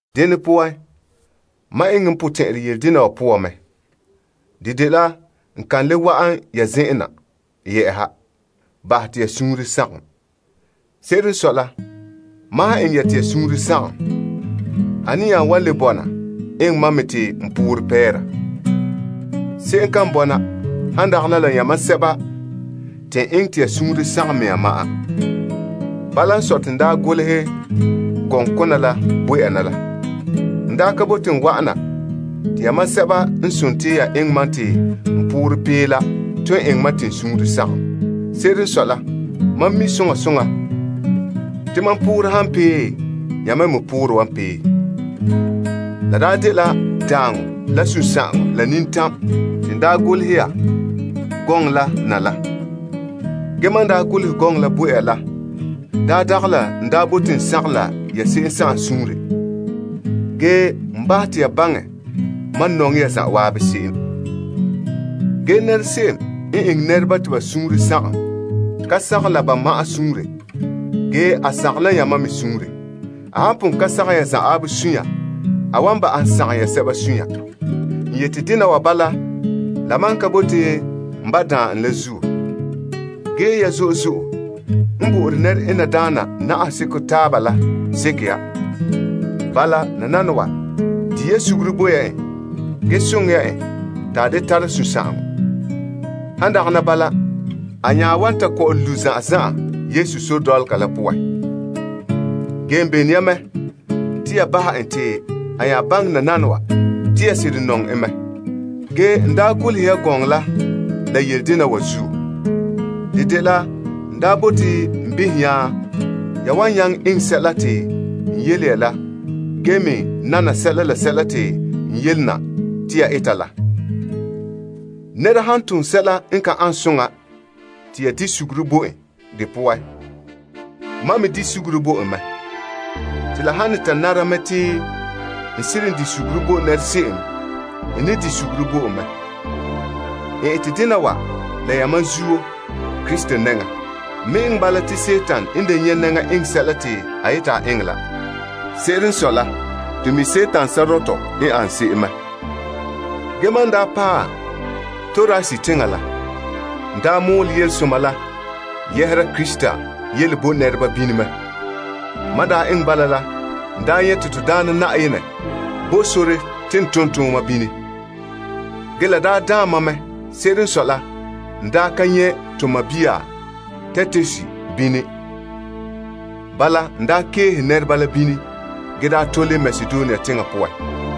Dene poan, mam eŋɛ n potɛn'ɛrɛ yele dena wa poan mɛ. De dela n ka le wa'an ya zen'en na bahɛ te ya suunre sagom. Se'ere n sɔe la, mam han eŋɛ ya te ya suunre sagom, ane nya wan le bɔna eŋɛ mam me te n poore pɛɛra? Se'em kan bɔna han dagana la yamam sɛba te n eŋɛ te ya suunre sagom mea ma'an. Bala n sɔe te n daa golehɛ gɔŋkona la bo ya na la. N daa ka bote n wa'ana te yamam sɛba n eŋɛ mam te n poorɛ pee la ton eŋɛ mam te n suunre sagom. Se'ere n sɔe la, mam mi soŋa soŋa te mam poorɛ han pee, yamam me poorɛ wan pee. La daa dela daaŋɔ la sunsagaŋɔ la nintam te n daa golehɛ ya gɔŋɔ la na la. Ge mam n daa golehɛ gɔŋɔ la bo ya la daa dagɛ la n daa bote n sagom la ya se'em suunre. Ge, n bahɛ te ya baŋɛ mam nɔŋɛ ya zan'an se'em. Ge se'em n eŋɛ nɛreba te ba suunre sagom, ka sagom la mam ma'an suunre, ge a sagom la yamam me suunre. A han pon ka sagom ya zan'an suunre, ge a wan ba'ahom sagom ya sɛba suunre. N yete dena wa bala la mam ka bote n ba' daan en la zuo. Ge ya zo'e zo'e n bo nɛre'enadaana namehe seko taaba la seke ya. Bala, nananawa, di ya suguru bo ya en, ge soŋɛ ya en te a da tara sunsagaŋɔ. Han dagana bala, a nya wan ta kɔ'ɔn lu' zan'an zan'an Yesu sore dɔlɔga la poan. Ge n belone ya mɛ te ya bahɛ en te a nya baŋɛ nananawa te ya seren nɔŋɛ en mɛ. Ge n daa golehɛ ya gɔŋɔ la la yele dena wa zuo. De dela n daa bote n behɛ nya ya wan nyaŋɛ eŋɛ sɛla te n yele ya la ge me nana sɛla la sɛla te n yele na te ya eta la. Nɛra han tom sɛla n ka ane soŋa te ya di' suguru bo n de poan, mam me di' suguru bo en mɛ. La han ne ta nara mɛ te n seren di' suguru bo se'em, n ne di' suguru bo mɛ. N ete dena wa la yamam zuo Krista nɛŋa. N me eŋɛ bala te Dima n da nyɛ' nɛŋa eŋɛ sɛla ta a yete a eŋɛ la. Se'ere n sɔe la, to mi' Dima sɔrɔtɔ n ane se'em mɛ. Ge mam n daa paɛ Troas teŋa la, n daa mɔɔlɛ Yelesoma la yɛhera Krista yele bo nɛreba bini mɛ. Mam daa eŋɛ bala la, n daa nyɛ te to Daana Na'ayenɛ bo sore te n tom tooma bini. Ge la daa daan mam mɛ. Se'ere n sɔe la, n daa ka nyɛ to sɔɔn Titus bini. Bala n daa keehe nɛreba la bini ge daa tole Makedonia teŋa poan.